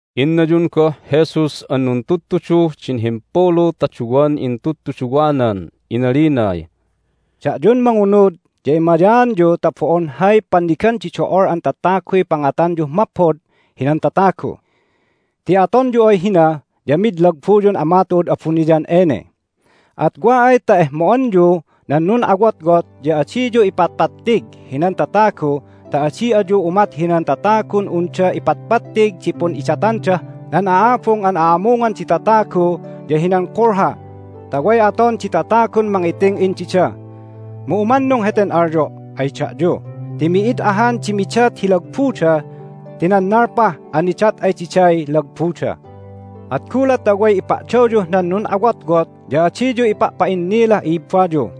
Innayun goh Jesus an nuntudtuduh din himpulu ta duwan intudtuduwanan inalinay, "Da'yun mangunud ya emayaanyu ta bo'on hay pannigan di do'ol an tataguy pangatanyuh maphod hinan tatagu. Ti atonyu ay hina ya mid lagbuyun Ama tu'ud abuniyan ene. At wa ay ta ehmo'anyu nan nun'awotwot ya adiyu ipatpattig hinan tatagu ta adi ayu umat hinan tatagun unda ipatpattig di pun'idatandah nan a'abung an a'amungan di tatagu ya hinan kulha ta way aton di tatagun mangiting'in dida. Mu umannung heten alyo' ay da'yu ti mi'id ahan di midat hi lagbuda ti nannalpah an nidat ay diday lagbuda. At gulat ta way ipa'dawyuh nan nun'awotwot ya adiyu ipa'pa'innilah i'ibbayu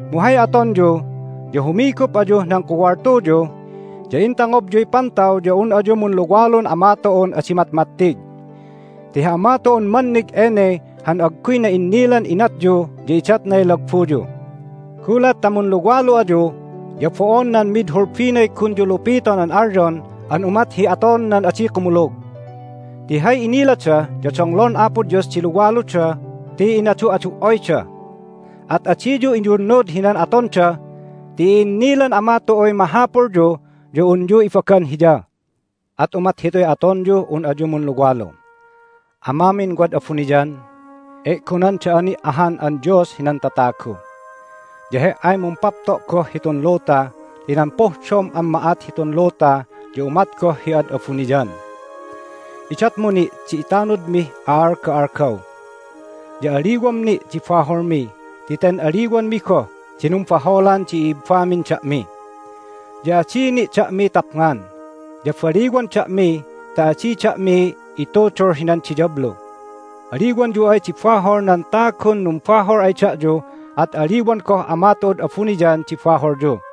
Mu hay atonyu ya humigup ayuh nan kuwaltuyu, ya intangobyuy pantaw ya un ayu munluwalun Ama tu'un adi matmattig. Ti hi Ama tu'un mannig ene han agguy na'innilan inatyu ya idatnay lagbuyu. Gulat ta munluwalu ayu ya bo'on nan mid hulbinay gunyu lupiton an alyon an umat hi aton nan adi kumulug. Ti hay inilada ya donglon Apo Dios di luwaluda ti inadu'adu"oyda. At adiyu iyunnud hinan atonda ti i'innilan Ama tu'uy mahapulyu ya unyu ibagan Hiya. At umat hituy atonyuh un ayu munluwalu: Amamin wad abuniyan, e'gonan da'a ni' ahan an Dios hinan tatagu. Ya He"ay mumpapto' goh hitun luta ti nan pohdom an ma'at hitun luta ya umat goh hi ad abuniyan. Idatmu ni' di itanudmih a'alga'algaw, ya aliwam ni' di baholmi ti ten aliwanmi goh di numbaholan di i'ibbamin da'mi. Ya adi ni' da'mi tapngan, ya baliwan da'mi ta adi da'mi itudul hinan diyablu. Aliwanyu ay di bahol nan tagun numbahol ay da'yu at aliwan goh Ama tu'ud abuniyan di baholyu.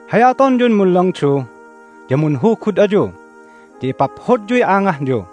Hay atonyun munlangdu ya munhugud ayu, ya ipaphodyuy angahyu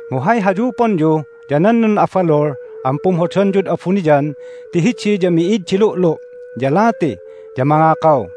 Mu hay hayuponyu ya nan nun'abalul an pumhodanyud abuniyan ti hidi ya mi'id di lu'lu', ya lati, ya mangakaw.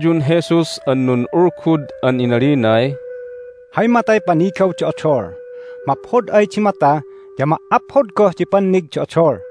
Innaynayun Jesus an nun'ulgud an inalinay, "Hay matay panigaw di odol. Maphod ay di mata ya ma"aphod goh di pannig di odol,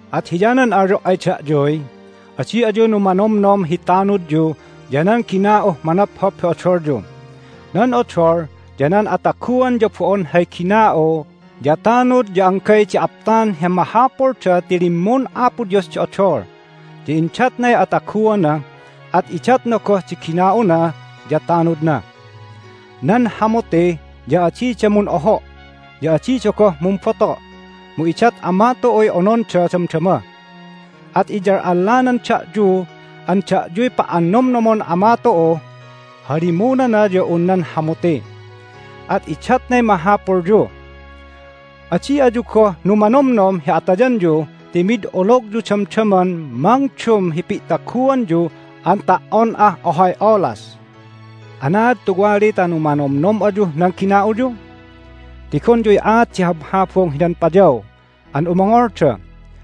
At hiyanan alyo' ay da'yuy, Adi ayu numanomnom hi tanudyu ya nan gina'uh manophop hi odolyu. Nan odol ya nan ataguan ya bo'on hay gina'u ya tanud ya anggay di aptan hi mahapulda ti limmun Apo Dios di odol, ya indatnay ataguana, at idatna goh di gina'una ya tanudna. Nan hamuti ya adida mun'oho', ya adida goh mumboto', mu idat Ama tu'uy ononda damdama! At iyal'allanan da'yu an da'yuy pa'annomnomon Ama tu'uh halimunana ya un nan hamuti, at idatnay mahapulyu! Adi ayu goh numanomnom hi atayanyu ti mid ologyu damdaman mangdum hi pi'taguanyu an ta"on ah ohay olas! Anaad tuwali ta numanomnom ayuh nan gina'uyu? Tigonyuy aat di habhabung hinan payaw an umongolda,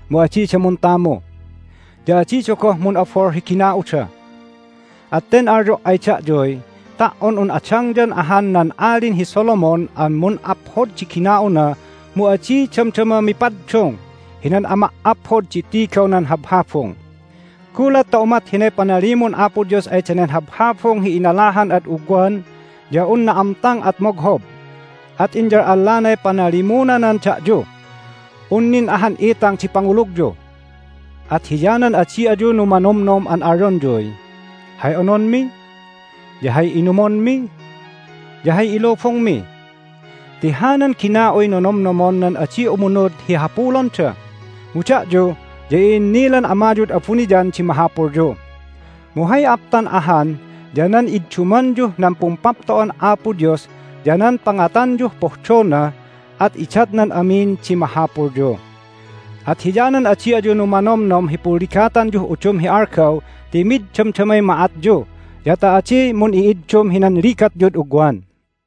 mu adida muntamu, ya adida goh mun'abol hi gina'uda. At ten alyo' ay da'yuy, Ta"on un adangyan ahan nan Alin hi Solomon an mun'aphod di gina'una mu adi damdama mipaddung hinan ama"aphod di tigaw nan habhabung! Gulat ta umat hinay panalimun Apo Dios ay danen habhabung hi inalahan ad ugwan ya un na'amtang at moghob, at inyal'allanay panalimunanan da'yu. Un nin ahan itang di pangulugyu! At hiyanan adi ayu numanomnom an alyonyuy, Hay ononmi? Ya hay inumonmi? Ya hay ilubungmi? Ti hanan gina'uy nonomnomon nan adi umunud hi hapulonda, mu da'yu ya i'innilan Amayud abuniyan di mahapulyu. Mu hay aptan ahan ya nan iddumanyuh nan Pumpapto'an Apo Dios ya nan pangatanyuh pohdona, at idatnan amin di mahapulyu. At hiyanan adi ayu numanomnom hi punligatanyuh udum hi algaw ti mid damdamay ma'atyu ya ta adi mun'i'iddum hinan ligatyud ugwan."